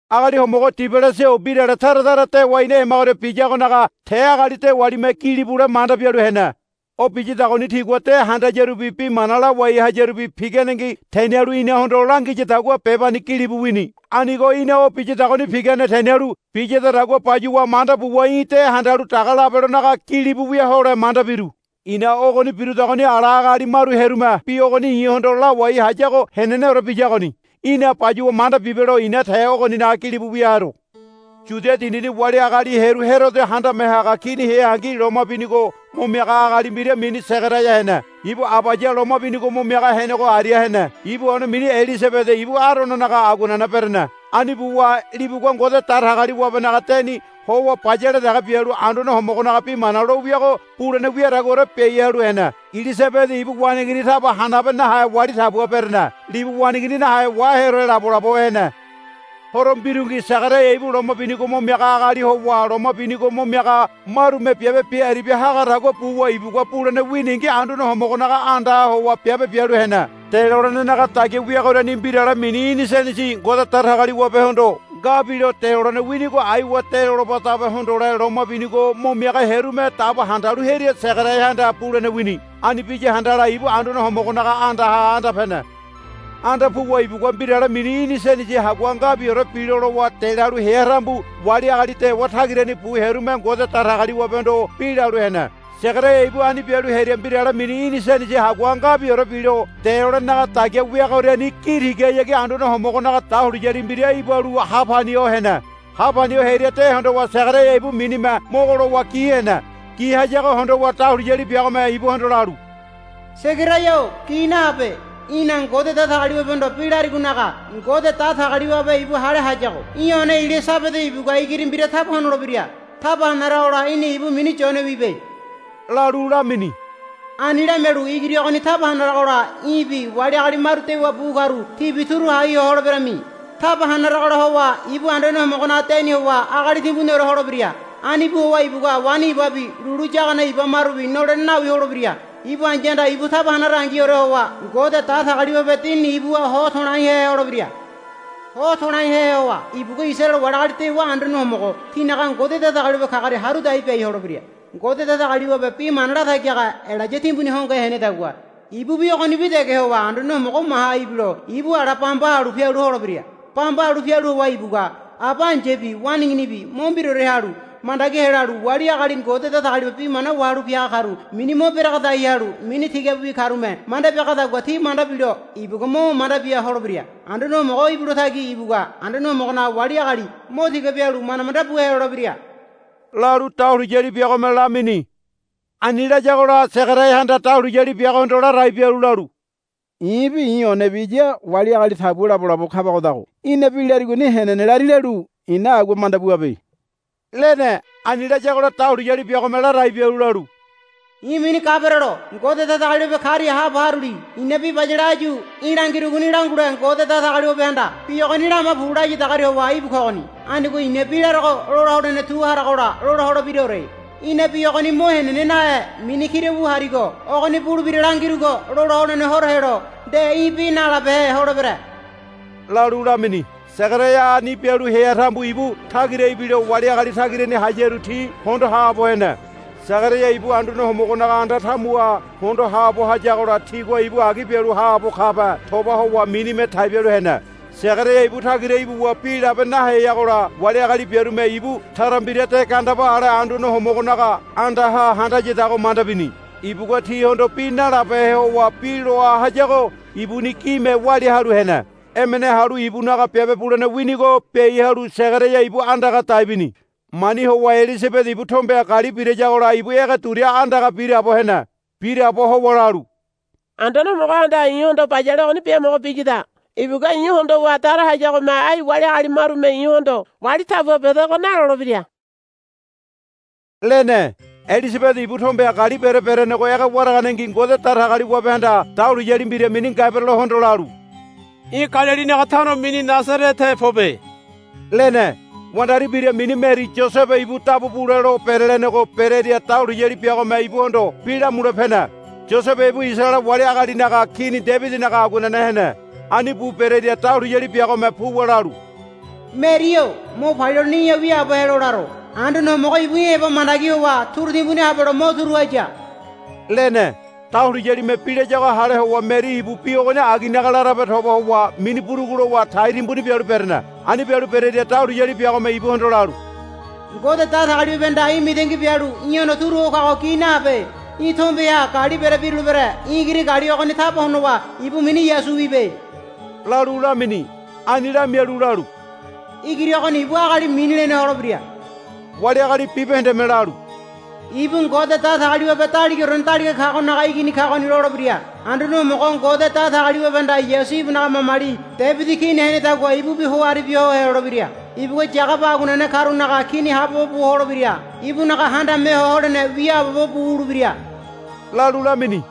Agali homogo Tiobilasa-o mbirale tara tara dewa ina hemagoria biyagonaga te agali dewalime gilibule manda bialu hene. O biyadagoni tigua de handayarubi bi mana lawai hayarubi piganengi tenialu inahondo langiyadagua bebani gilibu wini. Anigo i̱na o biyadagoni pigane tenialu biyadagua bayuwa manda buwa í̠ de handalu daga labelonaga gilibu wia hole manda biru. I̱na ogoni birudagoni ala agali maru hearume bi ogoni í̠hondo lawai hayago heneneore biyagoni í̠na bayuwa manda bibelo i̱na te ogoninaga gilibu wia haro. Yudia dindini wali agali hearu Herodo handame haga kini heangi loma binigo mo miaga agali mbira mini Segaraia hene. Ibu Abaya loma binigo mo miaga henego aria hene. Ibu one mini Ilisabede ibu Arononaga aguanene berene. Ani buwa libugua Ngode Datagaliwabenaga deni howa bayale dege bialu Anduane Homogonaga bi mana lo wiago bulene wiadaguaore biai halu hene. Ilisabede ibu waneigini taba hanabe nahe wali tabua berene. Libu waneigini nahe waheore labolabo hene. Horo mbirungi Segaraia ibu loma binigo mo miaga agali howa loma binigo mo miaga marume biabe bia aribia hagadagua buwa ibugua bulene winingi Anduane Homogonaga andaha howa biabe bialu hene. Delolenenaga dagia wiagoriani mbirale mini inisenesi Ngode Datagaliwabehondo nga bilo delolene winigo aiwa delolebadabe hondole loma binigo mo miaga hearume dabo handalu hearia Segaraiahanda bulene wini. Ani biya handala ibu Anduane Homogonaga andaha anda pene. Anda puwa ibugua mbirale mini inisenesi hagua ngabiore bilo lowa delalu hea tambu wali agali dewa tagirani bu hearume Ngode Datagaliwabehondo bi lalu hene. Segaraia ibu ani bialu hearia mbirale mini inisenesi hagua ngabiore bilo delolenenaga dagia wiagoriani gi tigahayagi Anduane Homogonaga dahuliyali mbira ibalu ha pani ho hene. Ha pani ho hearia de hondowa Segaraia ibu minime mogo lowa gi hene. Gi hayago hondowa dahuliyali biagome ibuhondo lalu, Segaraia-o gi nahabe. Í̠na Ngode Datagaliwabehondo bi larigonaga Ngode Datagaliwabe ibu hale hayago í̠ one Ilisabede ibugua igiri mbira taba honolebira. Taba hanaragola í̠na ibu mini Yone wibe, lalu lamini. Ani lamialu, Igiri ogoni taba hanaragola í̠bi wali agali maru dewa bu karu tibi turu hai ho holeberami. Taba hanaragola howa ibu Anduane Homogonaga deni howa agali timbuniore holebira. Ani bu howa ibugua waini ibabi lulu yagane iba marubi nolene nawi holebira. Ibu ai̱yahanda ibu taba hanarangiore howa Ngode Datagaliwabe Dinini ibuha ho to̱laihe holebira. Ho to̱laihe howa ibugua Isaraele wali agali dewa Anduane Homogo tinaga Ngode Datagaliwabe kagoria haru dai biai holebira. Ngode Datagaliwabe bi mana latagi haga Elaya timbuni hongohe henedagua ibubi ogonibi dege howa Anduane Homogo maha ibilo ibu ala bamba halu pialu holebira. Bamba halu pialu howa ibugua aba ai̱yabi waneiginibi mo mbiraore halu mandagi helalu wali agali Ngode Datagaliwabe bi mana wahalu piaga karu mini mo beregedai halu mini tigabiwi karume manda biagadagua ti manda bilo ibugua mo manda bia holebira. Anduane Homogo ibilo tagi ibugua Anduane Homogonaga wali agali mo tiga bialu manda manda bu helolebira, lalu dahuliyali biagome lamini. Ani layagola Segaraiahanda dahuliyali biagohondo ladai bialu lalu, I̱bi i̱ onebi iya wali agali tabua labolabo kabagodago í̠na bi larigoni henene lari lalu i̱na agua manda buabe, lene. Ani layagola dahuliyali biagome ladai bialu lalu, I̱ mini Gaberelo Ngode Datagaliwabe karia haabo haruli. I̱na bi bayale áyu í̠ langirugoni langule Ngode Datagaliwabehanda, Bi ogoni lama pu, layadagoria howa íbu kogoni. Anigo i̱na bi larogo lola holene tu haragola lola holebiraore. Í̠na bi ogoni mo henene nahe mini kira wu harigo ogoni bulebira langirugo lola holene horo helo nde í̠ bi nalabehe holebere, lalu lamini. Segaraia ani bialu hea tambu ibu tagira ibilo wali agali tagirani hayaru ti hondo haabo hene. Segaraia ibu Anduane Homogonaga anda tamuha hondo haabo hayagola tigua ibu agi bialu haabo kabe toba howa minime tai bialu hene. Segaraia ibu tagira ibuwa bi labe naheyagola wali agali biarume ibu tara mbira de gandeba ale Anduane Homogonaga andaha handayadago manda bini. Ibugua tihondo bi nalabehe howa bi loa hayago ibuni gime walia halu hene. Emene halu ibunaga biabe bulene winigo biai halu Segaraia ibu andaga dai bini. Mani howa Ilisabede ibu tombeha gali birayagola ibu ege duria andaga biraabo hene. Biraabo howa lalu, Anduane Homogohanda i̱hondo bayale ogoni biamogo biyada. Ibugua i̱ hondowa dara hayagome ai wali agali marume i̱hondo, Wali tabua bedego, nalolebira, lene. Ilisabede ibu tombeha gali bere berenego ege waraganengi Ngode Datagaliwabehanda dahuliyali mbira mini Gaberelohondo lalu, Í̠ Galilinaga tano mini Nasarete pobe, lene. Wandari mbira mini Meri Yosebe ibu dabu bule lo berelenego berearia dahuliyali biagome ibuhondo bi lamule pene. Yosebe ibu Isaraele wali agalinaga Kini Debidinaga aguanene hene. Ani bu berearia dahuliyali biagome puwa lalu, Meri-o mo palia holene í̠ha wiaabo helo laro. Anduane Homogo ibu í̠ heba mandagi howa turu timbuni habelo mo turu haya, lene. Dahuliyalime bi layago hale howa Meri ibu bi ogoni aginaga larabe toba howa mini burugu lowa tai timbuni bialu berene. Ani bialu berearia dahuliyali biagome ibuhondo lalu, Ngode Datagaliwabehanda í̠ mitangi bialu í̠hondo turu ho kago gi nahabe. Í̠ tombeha gali bere birulebere. Í̠ igiri gali ogoni taba honowa ibu mini Yasu wibe, lalu lamini. Ani lamialu lalu, Igiri ogoni ibu agali mini lene holebira. Wali agali bibahendeme lalu, Ibu Ngode Datagaliwabe Daligaorene Daliga Kagonaga Igini kagoni, lolebira. Anduane Homogo Ngode Datagaliwabehanda Yasu ibunaga mamali Debidi kini henedagua ibubi ho aribia ho helolebira. Ibugua Yagaba aguanene karunaga kini haabobo bu holebira. Ibunaga handame ho holene wiaabobo bu wulebira, lalu lamini.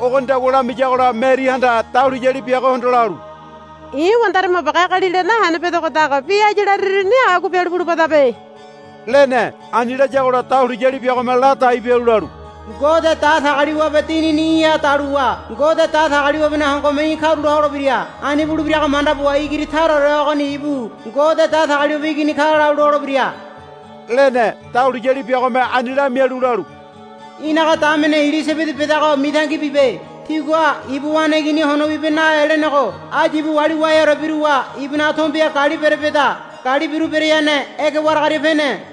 Ogonidagua lamiyagola Merihanda dahuliyali biagohondo lalu, I̱ wandari mabuage agalila nahene bedagodago bi áyu lariruni agua bialu bulubadabe, lene. Ani layagola dahuliyali biagome ladai bialu lalu, Ngode Datagaliwabe Dinini í̠ha daluwa Ngode Datagaliwabenaga hongome í̠ karula holebira. Ani bulebirago manda buwa igiri taraore ogoni ibu Ngode Datagaliwabe Igini ka lalu lolebira, lene. Dahuliyali biagome ani lamialu lalu, Í̠naga damene Ilisabede bedago mitangi bibe. Tigua ibu waneigini hono wibe nahe lenego áyu ibu wali waheore biruwa ibunaga tombeha gali bere beda. Gali biru bereane ege waragaria pene.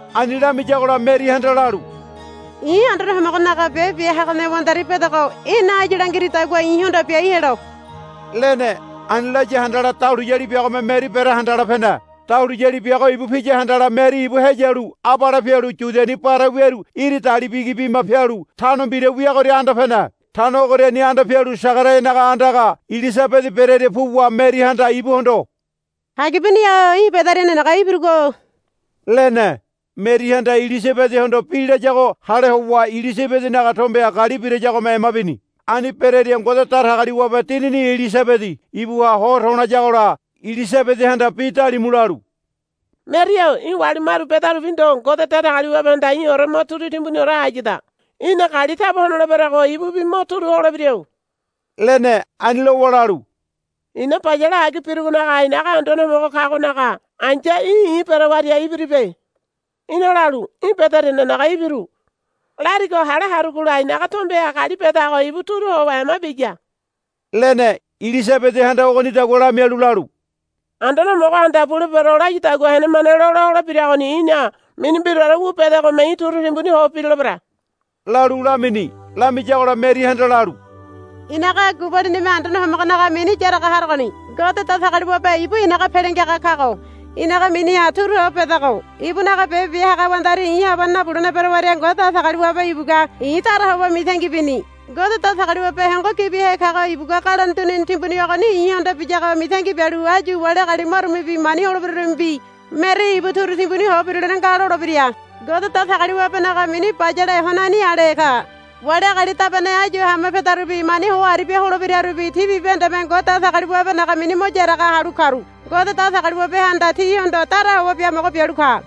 Ani lamiyagola Merihanda lalu, I̱ Anduane Homogonaga biabe bia hagane wandari bedogo í̠na áyu langiridagua i̱hondo biai helo, lene. Ani laya handala dahuliyali biagome Meri berea handala pene. Dahuliyali biago ibu piya handala Meri ibu heyalu abale pialu Yudiani bare wiaru iri dali bigi bima pialu tano mbira wiagoria anda pene. Tano ogoriani anda pialu Segaraianaga andaga Ilisabede bereria puwa Merihanda ibuhondo, Hagibuni-o í̠ bederia nenege ibirugo, lene. Merihanda Ilisabedehondo bi layago hale howa Ilisabedenaga tombeha gali birayagome ema bini. Ani bereria Ngode Datagaliwabe Dinini Ilisabede ibuha ho to̱layagola Ilisabedehanda bi dalimu lalu, Meri-o í̠ wali maru bedarubi ndo Ngode Datagaliwabehanda í̠ore mo turu timbuniore hayada. Í̠na gali taba honoleberego ibubi mo turu holebira, lene. Ani lowa lalu, I̱na bayale agi birugonaga i̱naga Anduane Homogo kagonaga ai̱ya í̠ i̱ berewaria ibiribe. Í̠na lalu, Í̠ bederia nenege ibiru, larigo hale harugola i̱naga tombeha gali bedago ibu turu howa ema biya, lene. Ilisabedehanda ogonidagua lamialu lalu, Anduane Homogohanda, Bulebero, layadagua henemane lola holebiragoni í̠na mini mbiraore wu bedegome í̠ turu timbuni ho birulebere, lalu lamini. Lamiyagola Merihanda lalu, I̱naga gubalinime Anduane Homogonaga mini yaraga harogoni. Ngode Datagaliwabe ibu i̱naga Pele Ngiaga kago i̱naga miniha turu ho bedogo. Ibunaga biabe bia haga wandari i̱ habane nabulene berewaria Ngode Datagaliwabe ibugua i̱ dara howa mitangi bini. Ngode Datagaliwabe Hongo Gibihe kago ibugua galone dunini timbuni ogoni i̱hondo biyago mitangi bialu áyu wali agali marumebi mani holebirarumebi, Meri ibu turu timbuni ho birulene nga, lolebira. Ngode Datagaliwabenaga mini bayale honani ale ka. Wali agali dabane áyu hama pedarubi mani ho aribia holebirarubi ti bibahendeme Ngode Datagaliwabenaga mini mo yaraga halu karu Ngode Datagaliwabehanda tihondo dara howa biamogo bialu ka.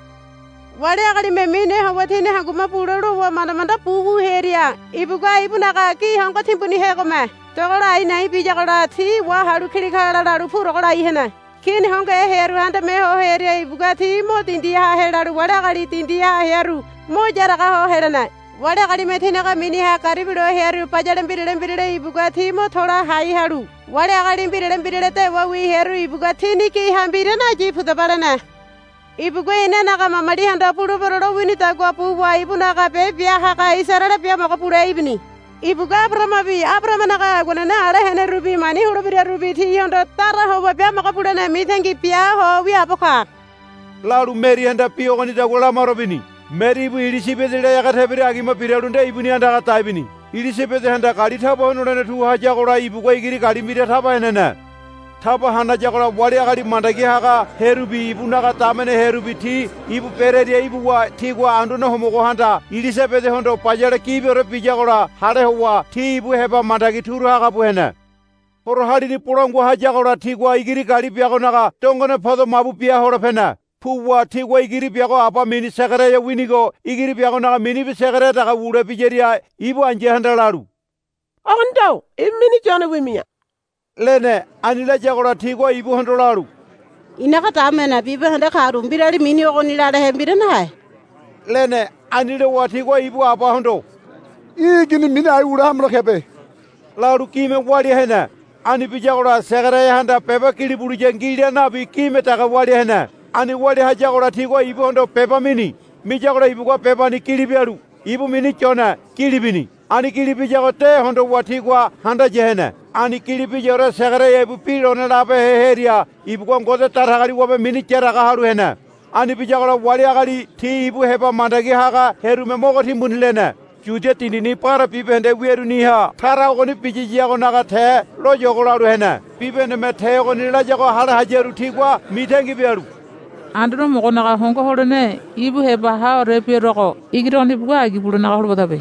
Wali agalime mine howa tini hangume bule lowa manda manda bu wu hearia ibugua ibunaga gi hongo timbunihegome dogola a̱i̱ na̱i̱ biyagola ti wahalu kilikala lalu purogo lai hene. Kini hongohe hearu handame ho hearia ibugua ti mo dindiha helalu wali agali dindiha hearu mo yaraga ho helene. Wali agalime tinaga miniha garibilo hearu bayale mbirale mbirale ibugua ti mo to̱la hai halu wali agali mbirale mbirale dewawi hearu ibugua tini giha mbira nayi, Pudaba, lene. Ibugua inanaga mamalihondo, Bulebero, lowinidagua buwa ibunaga biabe bia haga Isaraele biamogo bule ibini. Ibugua Abarahamabi Abarahamanaga aguanene ala henerubi mani holebirarubi tihondo dara howa biamogo bulene mitangi bia ho wiaabo ka, lalu Merihanda bi ogonidagua lamaro bini. Meri ibu Ilisabedela ege tebira agima biralu nde ibuni andaga dai bini. Ilisabedehanda gali taba honolene tu hayagola ibugua igiri gali mbira taba henene. Taba hanayagola wali agali mandagi haga hearubi ibunaga damene hearubi ti ibu berearia ibuwa tigua Anduane Homogohanda Ilisabedehondo bayale gibiore biyagola hale howa ti ibu heba mandagi turu haga bu hene. Horo halini bolangua hayagola tigua igiri gali biagonaga dongone podo mabu bia hole pene. Puwa tigua igiri biago aba mini Segaraia winigo igiri biagonaga minibi Segaraia dege wule biyaria ibu ai̱yahanda lalu, Ogoni ndo ibu mini Yone wimi̱ya, lene. Ani layagola tigua ibuhondo lalu, Í̠naga damene bibahende karu mbirali mini ogoni lalehe mbira nahe, lene. Ani lowa tigua ibu abahondo, Í̠ igini mini ai wule hamelo kebe, lalu gime walia hene. Ani biyagola Segaraiahanda beba gili buliya ngi la nabi gime dege walia hene. Ani walia hayagola tigua ibuhondo beba mini. Miyagola ibugua bebani gili bialu, Ibu mini Yone, gili bini. Ani gili biyago de hondowa tigua handaya hene. Ani gili biyaore Segaraia ibu bi lone labehe hearia ibugua Ngode Datagaliwabe mini yaraga halu hene. Ani biyagola wali agali ti ibu heba mandagi haga hearume mogo timbuni lene. Yudia dindini bare bibahende wiaruniha tara ogoni biyiyagonaga te loyogo lalu hene. Bibahendeme te ogoni layago hale hayaru tigua mitangi bialu, Anduane Homogonaga hongo holene ibu heba haore biaruago igiri ogoni ibugua agi bulenaga holobadabe,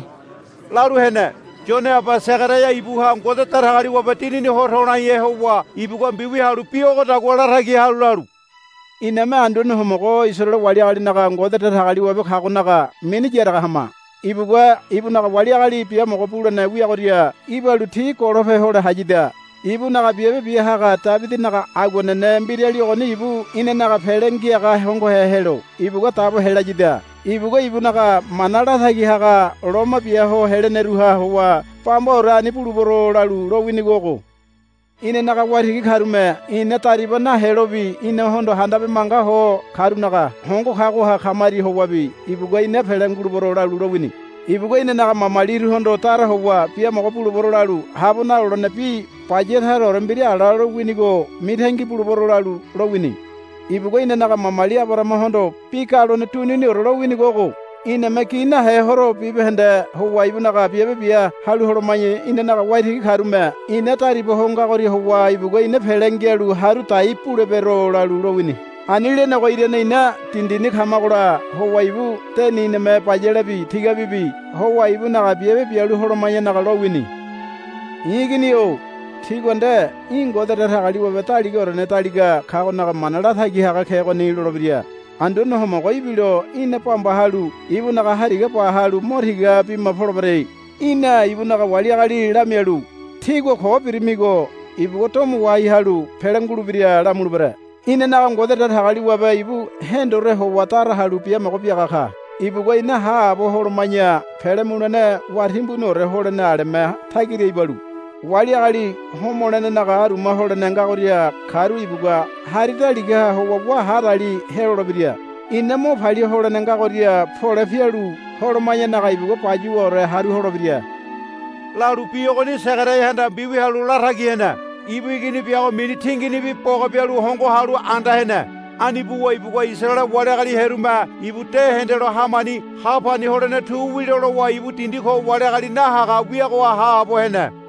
lalu hene. Yone aba Segaraia ibuha Ngode Datagaliwabe Dinini ho to̱laihe howa ibugua mbiwia halu bi ogodagua latagi halu lalu, Iname Anduane Homogo Isaraele wali agalinaga Ngode Datagaliwabe kagonaga mini yaraga hama. Ibugua ibunaga wali agali biamogo bulene wiagoria ibalu ti golope hole hayada. Ibunaga biabe bia haga Debidinaga aguanene mbirali ogoni ibu inanaga Pele Ngiaga hongohe helo ibugua dabo helayada. Ibugua ibunaga mana latagi haga lomo bia ho heleneruha howa bambaore ani bulebero lalu lowinigo ogo. Inanaga waitigi karume ina dariba nahelobi inahondo handabe manga ho karunaga hongo kagoha kamaria howabi ibugua, I̱na pele ngulebero, lalu lowini. Ibugua inanaga mamalihondo dara howa, Biamogo bulebero, lalu, Habo nalolene bi baya taraore mbira ala lowinigo mitangi bulebero, lalu lowini. Ibugua inanaga mamali Abarahamahondo bi galone duniniore lowinigo ogo, Iname gi nahe horo bibahende howa ibunaga biabe bia halu holoma̱ya inanaga waitigi karume ina dariba ho ngagoria howa ibugua ina pele ngialu haru dai bulebero, lalu lowini. Ani lenego irane ina dindini kamagola howa ibu deni iname bayalebi tigabibi howa ibunaga biabe bialu holoma̱yanaga lowini. I̱ igini-o tigua nde, Í̠ Ngode Datagaliwabe Daligaorene Daliga Kagonaga mana latagi haga kegoni, lolebira. Anduane Homogo ibilo í̠na bamba halu ibunaga hariga ba halu mo tiga bima polebere. Í̠na ibunaga wali agali lamialu, Tígua ko birimigo ibugua domo wahai halu pele ngulebira, lamulebere. Inanaga Ngode Datagaliwabe ibu hendore howa dara halu biamogo biaga ka. Ibugua ina haabo holoma̱ya pele mulene wá timbuniore holene aleme tagira ibalu wali agali homolenenaga aruma holene ngagoria karu ibugua hari daligaha howa wá hadali helolebira. Ina mo palia holene ngagoria pole pialu holoma̱yanaga ibugua bayuwaore haru holebira, lalu bi ogoni Segaraiahanda mbiwia halu latagi hene. Ibu igini biago mini tinginibi boga bialu hongo halu anda hene. Ani buwa ibugua Isaraele wali agali hearume ibu de hendelo hamani ha pani holene tu wilo lowa ibu dindi ko wali agali nahaga wiagoha haabo hene.